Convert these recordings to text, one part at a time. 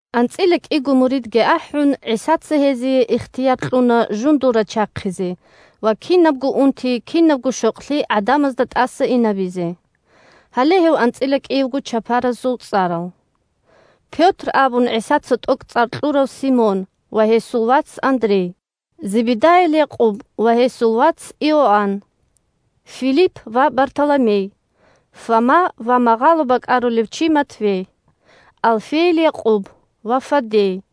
АнцӀила кӀиго муридги ахӀун, ГӀисаца гьезие ихтияр кьуна жундул рачахъизе ва кинабго унти, кинабго щокълъи гӀадамазда тӀаса инабизе. Гьале гьев анцӀила кӀиявго чапарасул цӀарал: Пётр абун ГӀисаца тӀокӀцӀар кьурав Симон ва гьесул вац Андрей, Зебедайил Якъуб ва гьесул вац Иоанн, Филипп ва Бартоломей, Фома ва магъало бакӀарулев чи Матфей, Алфейил Якъуб ва Фаддей,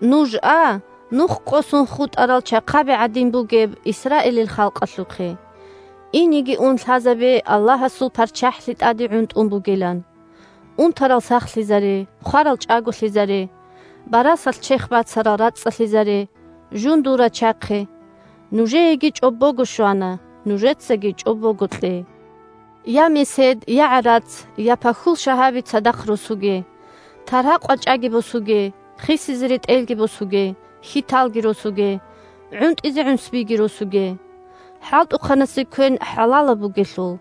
Нуж а нух къосун хутӀарал чахъаби гӀадин бугеб Исраилил халкъалъухъе. Инеги ун лъазабе Аллагьасул ПарччахӀлъи тӀаде гӀунтӀун бугилан. Унтарал сахлъизаре, хварал чӀаголъизаре, барасалъ черх бацарал рацӀцӀалъизаре, жундул рачахъе; нужееги чӀобого щвана, нужецаги чӀобого кье. Я месед, я гӀарац, я пахьул шагьаби цадахъ росуге; таргьа-къвачӀаги босуге, хисизе ретӀелги босуге, хьиталги росуге, гӀунтӀизе гӀунсбиги росуге. ХӀалтӀухъанасе квен хӀалалаб бугелъул.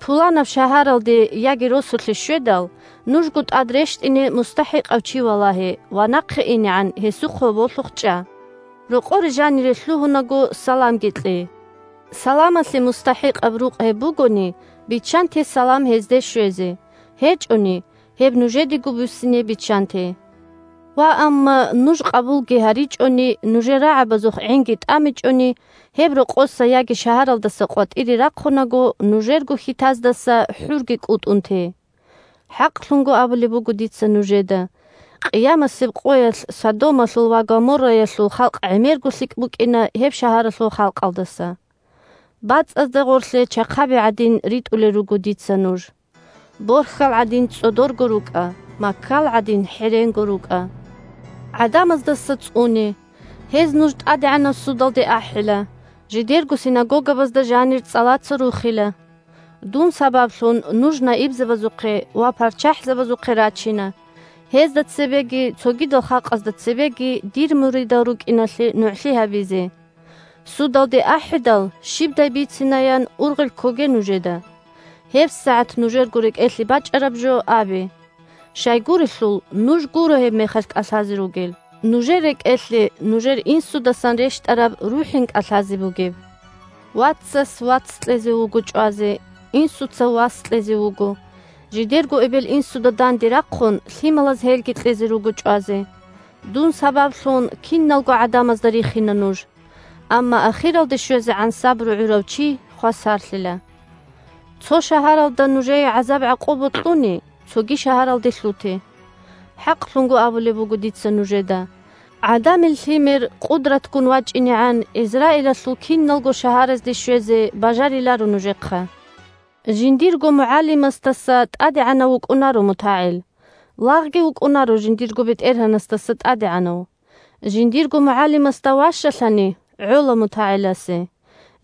Пуланаб шагьаралде яги росулъе щведал, нужго тӀад рещтӀине мустахӀикъав чи валагье ва нахъе инегӀан гьесухъ гьоболлъухъ чӀа. Рокъоре жанире лъугьунаго саламги кье. Саламалъе мустахӀикъаб рукъ гьеб бугони, биччанте салам гьезде щвезе, гьечӀони – гьеб нужедего буссине биччанте. Ваамма нуж къабулги гьаричӀони, нужер рагӀабазухъ гӀинги тӀамичӀони, гьеб рокъоса яги шагьаралдаса къватӀире рахъунаго нужерго хьитаздаса хӀурги кӀутӀун те. ХӀакълъун абулеб буго дица нужеда: къиямасеб къоялъ Содомалъул ва Гоморраялъул халкъ гӀемерго лъикӀ букӀина гьеб шагьаралъул халкъалдаса. БацӀазда гъорлъе чахъаби гӀадин ритӀулел руго дица нуж. Борхьал гӀадин цӀодорго рукӀа, маккал гӀадин хӀеренго рукӀа. ГӀадамаздаса цӀуне. Гьез нуж тӀадегӀанаб судалде ахӀила, жидерго синагогабазда жанир цӀалаца рухила. Дун сабаблъун нуж наибзабазухъе ва парччахӀзабазухъе рачина, гьезда цебеги цогидал халкъазда цебеги дир муридал рукӀиналъе нугӀлъи гьабизе. Судалде ахӀидал щибдай бицинаян ургъел ккоге нужеда. ГьебсагӀат нужерго рекӀелъе бачӀараб жо абе. Щайгурелъул, нуж гуро гьебмехалъ кӀалъазе ругел, нужер рекӀелъе нужер Инсудасан рещтӀараб РухӀин кӀалъазе бугеб. Вацас вац кьезе вуго чӀвазе, инсуца вас кьезе вуго; жидерго эбел-инсуда данде рахъун лъималаз гьелги кьезе руго чӀвазе. Дун сабаблъун киналго гӀадамазда рихина нуж. Амма ахиралде щвезегӀан сабру гӀурав чи хвасарлъила. Цо шагьаралда нужее гӀазаб-гӀакъуба кьуни, цоги шагьаралде лъуте. ХӀакълъун абулеб буго дица нужеда: ГӀадамил Лъимер къудратгун вачӀинегӀан ГӀизраилалъул киналго шагьаразде щвезе бажариларо нужехъа. Жиндирго мугӀалимасдаса тӀадегӀанав вукӀунаро мутагӀил, лагъги вукӀунаро жиндирго бетӀергьанасдаса тӀадегӀанав. Жиндирго мугӀалимасда ващалъани, гӀола мутагӀиласе,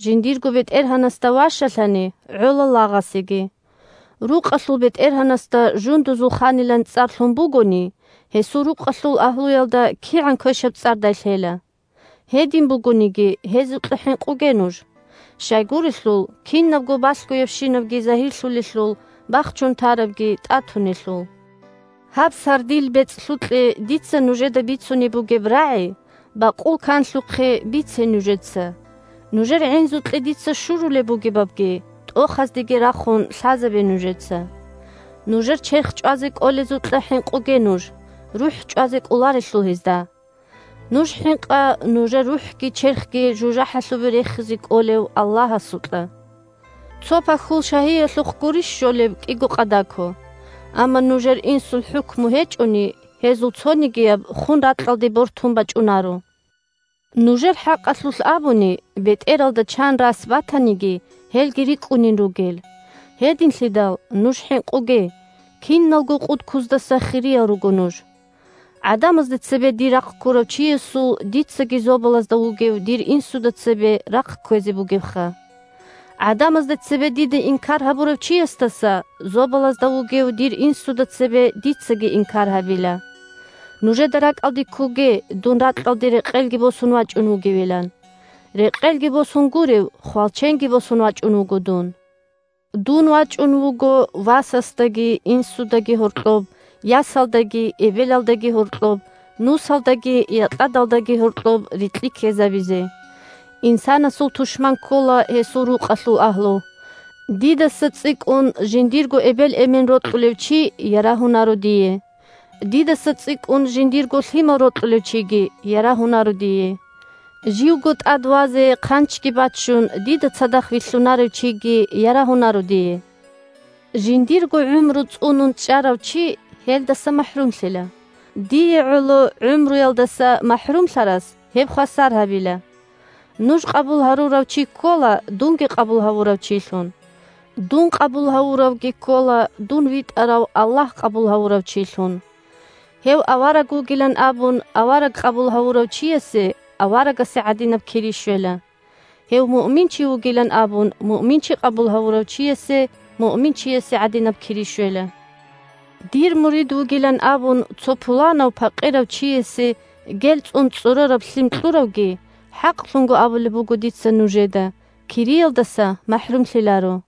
жиндирго бетӀергьанасда ващалъани, гӀола лагъасеги. Рукъалъул бетӀергьанасда жундузул ханилан цӀар лъун бугони, гьесул рукъалъул агьлуялда кигӀан квешаб цӀардай лъела. Гьедин бугониги, гьезукьа хӀинкъуге нуж! Щайгурелъул кинабго балъгоябщинабги загьирлъулелъул, бахчун тарабги тӀатунелъул. Гьаб сардил бецӀлъукье дица нужеда бицунеб бугеб рагӀи бакъул канлъухъе бице нужеца; нужер гӀинзукье дица щурулеб бугебабги тӀохаздеги рахун лъазабе нужеца. Нужер черх чӀвазе кӀолезукьа хӀинкъуге нуж, – рухӀ чӀвазе кӀоларелъул гьезда. Нуж хӀинкъа нужер рухӀги черхги жужахӀалъубе рехизе кӀолев Аллагьасукьа. Цо пахьул шагьиялъухъ гурищ щолеб кӀиго къадако. Амма нужер Инсул хӀукму гьечӀони, гьезул цонигияб хун ракьалде бортун бачӀунаро. Нужер хӀакъалъулъ абуни, бетӀералда чан рас батаниги, гьелги рикӀкӀунин ругел. Гьединлъидал нуж хӀинкъуге: киналго къудкуздаса хириял руго нуж. ГӀадамазда цебе дир рахъ ккурав чиясул дицаги зобалазда вугев дир Инсуда цебе рахъ кквезе бугебха. ГӀадамазда цебе диде инкар гьабурав чиясдаса зобалазда вугев дир Инсуда цебе дицаги инкар гьабила. Нужеда ракӀалде ккоге дун ракьалде рекъелги босун вачӀун вугевилан. Рекъелги босун гурев, хвалченги босун вачӀун вуго дун. Дун вачӀун вуго васасдаги инсудаги гьоркьоб, ясалдаги эбелалдаги гьоркьоб, нусалдаги якьадалдаги гьоркьоб рикьи ккезабизе. Инсанасул тушман ккола гьесул рукъалъул агьлу. Дидаса цӀикӀкӀун жиндирго эбел-эмен рокьулев чи ярагьунаро дие. Дидаса цӀикӀкӀун жиндирго лъимал рокьулев чиги ярагьунаро дие. Живго тӀад вазе хъанчги баччун, дида цадахъ вилълъунарев чиги ярагьунаро дие. Жиндирго гӀумру цӀунун чӀарав чи гьелдаса махӀрумлъила; дие гӀоло гӀумруялдаса махӀрумлъарас гьеб хвасар гьабила. Нуж къабул гьарурав чи ккола дунги къабул гьавурав чилъун, дун къабул гьавуравги ккола дун витӀарав Аллагь къабул гьавурав чилъун. Гьев авараг вугилан абун, авараг къабул гьавурав чиясе аварагасе гӀадинаб кири щвела. Гьев муъминчи вугилан абун, муъминчи къабул гьавурав чиясе муъминчиясе гӀадинаб кири щвела. Дир мурид вугилан абун, цо пуланав, пакъирав чиясе гел цӀун цӀорораб лъим кьуравги, хӀакълъун абулеб буго дица нужеда, кириялдаса махӀрумлъиларо.